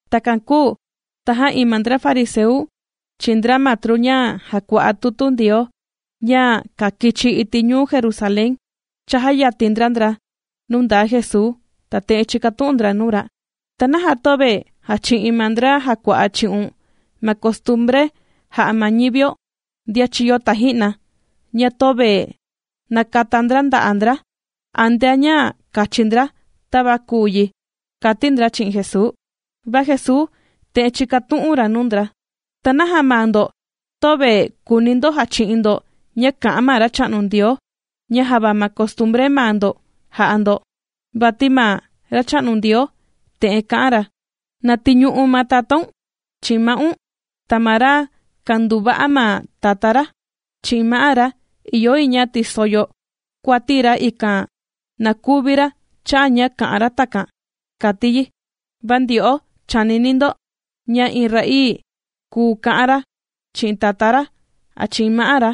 Takan kūu tajan iin ma ndra fariseu, chi'in ndra matru ña jàkua'a tutu Ndioo ña kākichi iti' ñuu Jerusalén, chàjayatin ndra ndra nuu ndaa Jesuu, ta te'en chīkatu'un ndra nuu ra: ―¿Ta naja töve jàchi'in ma ndra jàkua'a chi'un, ma costumbre jā'a ma ñivio, ndian chīyo taji'na, ña töve nàkata ndra nda'a' ndra antea ña kàchi ndra tava kùu yi? ―kàti ndra chi'in Jesuu. Va Jesuu te'en chīkatu'un ra nuu ndra: ―¿Ta naja maa ndo töve kùuni ndo jachi'in ndo ña kà'an ma Racha'nu Ndioo, ña java ma costumbre maa ndo jà'a ndo? Vati ma Racha'nu Ndioo te'en kā'an ra: “Na tiñu'u̱n ma tatáun, chi'in ma'un.” “Ta ma ra kànduva'a ma tatá ra, chi'in ma'á ra, ìyo yi ña tiso yo kuati ra, ikan na kuvi ra cha'a' ña kà'an ra takan,” kàti yi. Va ndyo'o chànini ndo ña iin ra'ii kùu ka'an ra chi'in tatá ra, a chi'in ma'á ra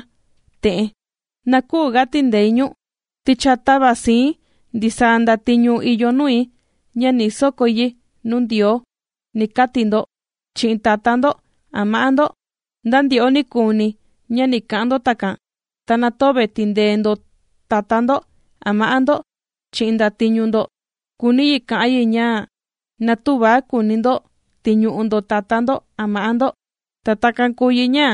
te'en: “Na küu ga tìndei ñu̱n, ti cha tāva sii̱n ndisaa ndatiñu ìyo nui ña ni sokói yi nuu Ndioo”, ni kati ndo chi'in tatá ndo a ma'á ndo. Nda ndyo'o nikuuni ña ni ka'an ndo takan, ta na töve tìndee ndo tatá ndo a ma'á ndo chi'in ndatiñu ndo, kùuni yi ka'an yi ña na tüva kuuni ndo tiñu'u ndo ma tatá ndo a ma'á ndo. Ta takan kùu yi ña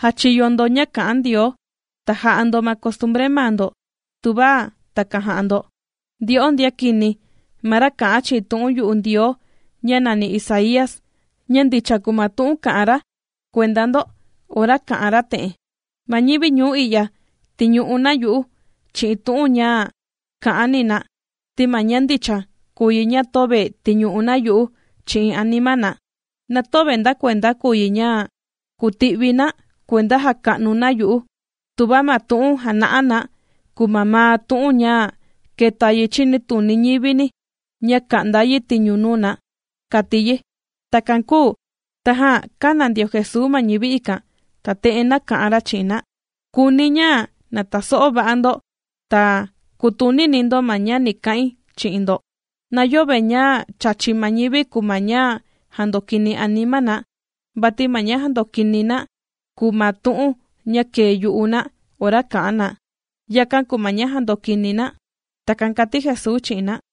jàchiyo ndo ña kà'an Ndioo, ta jà'a ndo ma costumbre maa ndo, tuva takan jà'a ndo. ¡Ndyo'o ndian kini! Ma ra kā'an chi'in tu'un yu'u Ndioo ña nàni Isaía, ña ndicha kùu ma tu'un kā'an ra kuenda ndo ora kā'an ra te'en: Ma ñivi ñuu i'ya, tìñu'u na yu'u chi'in tu'un ña kà'an ni na, ti ma ña ndicha, kùu yi ña na töve tìñu'u na yu'u chi'in anima na. Na töve ndakuenda kùu yi ña kùti'vi na kuenda jàka'nu na yu'u, tuva ma tu'un jàna'a na kùu mamaa tu'un ña kèta yi chinituni ñivini ña ka'nda yi tiñu nuu na kàti yi. Takan kūu tajan kāna ndio Jesuu ma ñivi ikan, ta te'en nāka'an ra chi'in na: ―Kùuni̱ ña na taso'o va'a ndo, ta kùtunini ndo ma ña ni ka'in chi'in ndo: Na yöve ña chàchi ma ñivi kùu ma ña jàndokini anima na, vati ma ña jàndokini na kùu ma tu'un ña kèe yu'u na ora kà'an na, yakan kùu ma ña jàndokini na. ―Takan kàti Jesuu chi'in na.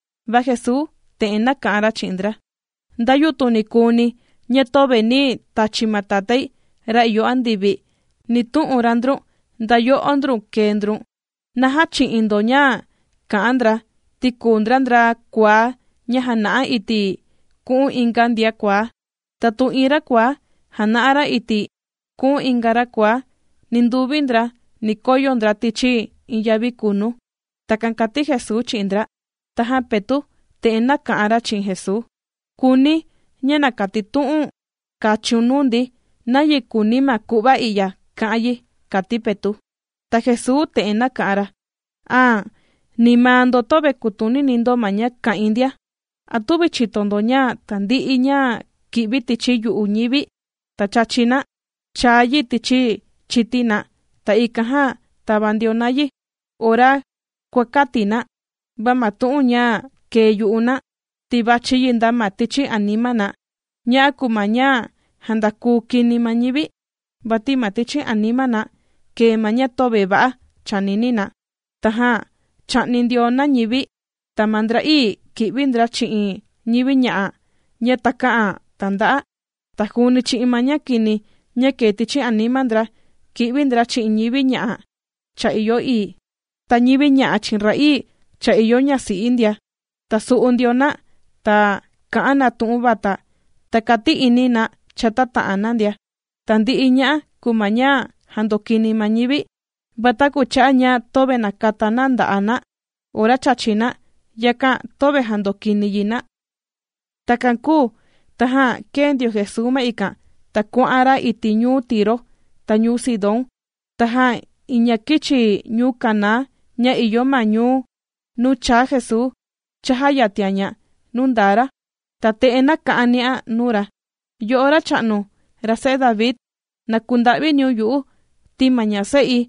Va Jesuu te'en nāka'an ra chi'in ndra: ―Nda yutun nikuuni ña töve nī tachi ma Tatái ra ìyo andivi, ni tu'un ra ndrun nda yo'ó ndrun kèe ndrun. Na jächi'in ndo ña kà'an ndra, ti kùu ndra, ndra kuaá ña jàna'a iti' ku'un inga ndian kuaá. Tatu iin ra kuaá jàna'a ra iti' ku'un inga ra kuaá, ninduvi ndra ni koyo ndra tichi iin yavi kunu. ―Takan kàti Jesuu chi'in ndra. Tajan Petu' te'en nāka'an ra chi'in Jesuu: ―Kùuni̱ ña na katitu'un kachiun nuu ndi nayi kùuni ma ku'va i'ya ka'an yi ―kàti Petu'. Ta Jesuu te'en nāka'an ra: ―¿A nda maa ndo töve kùtunini ndo ma ña kà'in ndia? ¿A tüvi chìto ndo ña tandi'i ña kì'vi tichi yu'u ñivi, ta chàchi na, chàa yi tichi chití na, ta ikan jan tàva ndio na yi ora kuàkati na? Va ma tu'un ña kèe yu'u na, ti vàchi yi nda ma tichi anima na, ña'a kùu ma ña jandakuu kini ma ñivi. Vati ma tichi anima na kèe ma ña töve va'a chànini na, tajan chà'ni ndio na ñivi, ta ma ndra'ii kì'vi ndra chi'in ñivi ña'a ña takä'an tànda'a. Ta juuni chi'in ma ña kini ña kèe tichi anima ndra, kì'vi ndra chi'in ñivi ña'a cha ìyo ii, ta ñivi ña'a chi'in ra'ii cha ìyo ñasi'i ndia. Ta sù'u ndio na, ta kà'an na tu'un vata ta kàti'ini na chata ta'an na ndia. Tandi'i ña'a kùu ma ña jàndokini ma ñivi. Va taku cha'a' ña töve nàkata na nda'a' na ora chàchi na, yakan töve jàndokini yi na. Takan kūu tajan kēe ndio Jesuu ma ikan, ta kuà'an ra iti' ñuu Tiro, ta ñuu Sidón. Tajan iin ña kīchi ñuu Caná ña ìyo ma ñuu nuu chāa Jesuu, chājayatian ña nuu ndaa ra, ta te'en nāka'an ni'an nuu ra: ―¡Yo'o Racha'nu, ra se'e David, na kunda'viniun yu'u! Ti ma ña se'i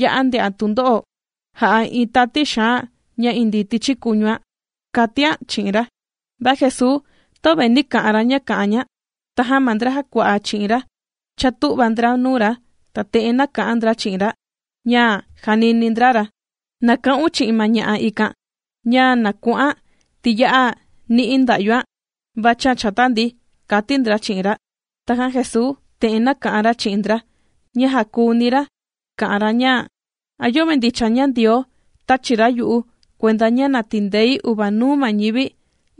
ya'a ndè'an tundo'o jà'a iin tati xaan ña indii tichi kuñuan, ―kàtian chi'in ra. Va Jesuu töve nī ka'an ra ña kà'an ña. Tajan ma ndra jàkua'a chi'in ra chātu'va ndra nuu ra, ta te'en nāka'an ndra chi'in ra ña jànini ndra ra: ―Na ka'un chi'in ma ña'a ikan, ña na ku'an, ti ya'a ni'i nda'yuan vàchian chata ndi, ―kàti ndra chi'in ra. Tajan Jesuu te'en nāka'an ra chi'in ndra ña jàkuuni ra kà'an ra ña: ―¿A yöve ndicha ña Ndioo tāchi ra yu'u kuenda ña na tindei uvanuu ma ñivi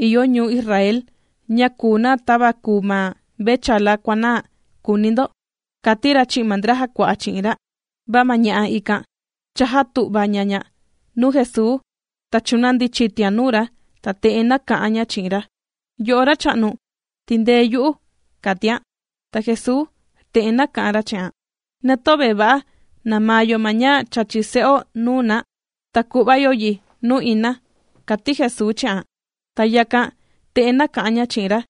ìyo ñuu Israel ña kùu na tava kùu ma mvechala kuànaa?, kùuni ndo, ―kàti ra chi'in ma ndra jàkua'a chi'in ra. Va ma ña'a ikan chājatu'va ña ña nuu Jesuu, ta chūnandi chitian nuu ra, ta te'en nāka'an ña chi'in ra: ―¡Yo'o Racha'nu, tindee yu'u! ―kàtian. Ta Jesuu te'en nāka'an ra chi'an: ―Na töve va'a namaa yo ma ña chàchi se'o nuu na, ta ku'va yo yi nuu ina ―kàti Jesuu chi'an. Ta yakan, te'en nāka'an ña chi'in ra: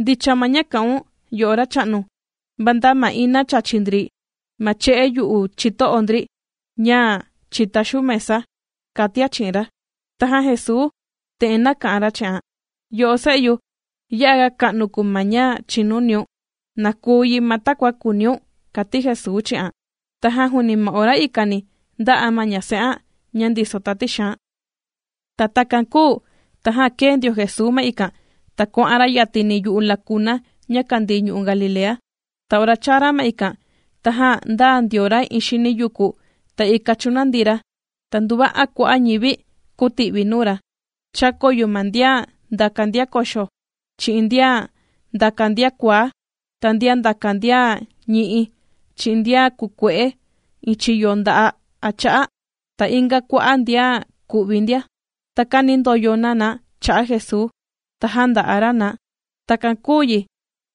―Ndicha ma ña kà'un yo'o Racha'nu, va nda ma ina chàchi ndri ma che'e yu'u chito'o ndri ña chìtá xuu mesa ―kàtian chi'in ra. Tajan Jesuu te'en nāka'an ra chi'an: ―¡Yo'o se'yu! ¡Ya'a ga ka'nu kùu ma ña chìnuniun! Na kuu yi ma takua kùuniun ―kàti Jesuu chi'an. Tajan juuni ma ora ikani ndā'a ma ña se'an ña ndiso tati xaan. Takan kūu tajan kēe ndio Jesuu ma ikan, ta kuà'an ra yatini yu'u lakuna ña kàndii ñu'u' Galilea. Ta ora chāa ra ma ikan, tajan ndāa ndio ra iin xini yuku, ta ikan chūnandi ra. Ta nduva'a kua'a' ñivi kūti'vi nuu ra. Chākoyo ma ndian ndàka ndian koxo, chi'in ndian ndàka ndian kuaá, ta ndian ndàka ndian ñi'i, chi'in ndian kukue'e iin chiyo nda'a' a cha'a, ta inga kua'a' ndian ku'vi ndia. Ta kānindoyo na na cha'a Jesuu, ta jānda'a ra na. Takan kūu yi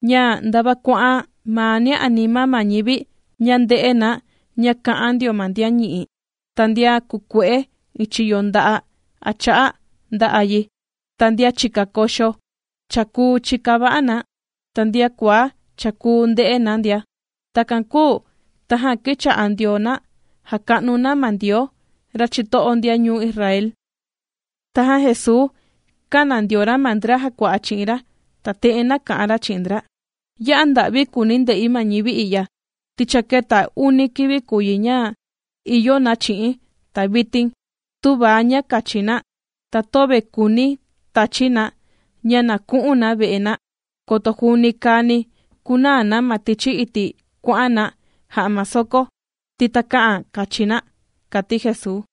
ña ndava kuà'an mania anima ma ñivi ña ndè'e na ña, kà'an ndio ma ndian ñi'i. Ta ndian kukue'e iin chiyo nda'a' a cha'a', ndā'a yi. Ta ndian chìka koxo, cha kùu chika va'a na. Ta ndian kuaá, cha kùu ndè'e na ndia. Takan kūu, tajan kīcha'a ndio na jàka'nu na ma Ndioo, ra chito'o ndian ñuu Israel. Tajan Jesuu kāna ndio ra ma ndra jàkua'a chi'in ra, ta te'en nāka'an ra chi'in ndra: ―Ya'a nda'vi kùuni̱ nde'i ma ñivi i'ya, ti cha kēta uni kivi kùu yi ña ìyo na chi'i̱n, ta vitin tüva ña kachi na. Ta töve kùuni̱ tachi̱ na ña na ku'un na ve'e na, koto juuni kàani kunaa na ma tichi iti' kuà'an na jà'a ma soko, ti takä'an kachi na ―kàti Jesuu.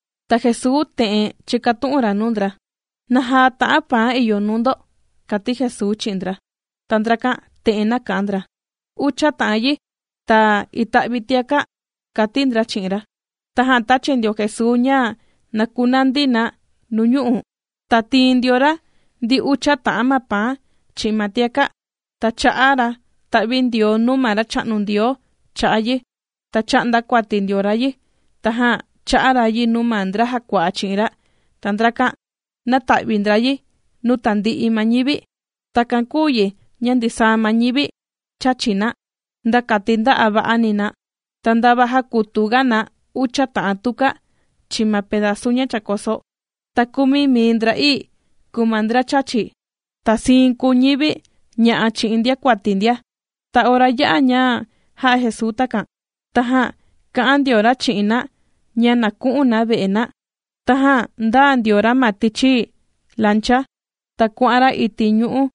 Ta Jesuu te'en chīkatu'un ra nuu ndra: ―¿Naja ta'an paan ìyo nuu ndo? ―kàti Jesuu chi'in ndra. Ta ndrakan te'en nāka'an ndra: ―Ucha ta'an yi, ta ita'vi tiaka' ―kàti ndra chi'in ra. Tajan tāchi ndio Jesuu ña na kunandi na nuñu'u'. Ta tīin ndio ra ndi ucha ta'an ma paan, chi'in ma tiaka', ta chā'a ra ta'vindioo nuu ma Racha'nu Ndioo cha'a' yi, ta chā'nda kuati ndio ra yi, tajan chā'a ra yi nuu ma ndra jàkua'a chi'in ra, ta ndrakan nāta'vi ndra yi nuu tandi'i ma ñivi. Takan kūu yi ña ndisaa ma ñivi chāchi na, nda kati nda'a va'ani na. Ta ndava jākutuga na ucha ta'an tuka, chi'in ma pedazu ña chākoso. Ta kumi mii ndra'ii kùu ma ndra chāchi, ta siin kùu ñivi ña'a chi'in ndiakuati ndia. Ta ora yā'a ña jā'a Jesuu takan, tajan kà'an ndio ra chi'in na ña na ku'un na ve'e na, tajan ndāa ndio ra ma tichi lancha, ta kuà'an ra iti' ñu'u'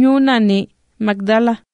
ñuu nàni Magdala.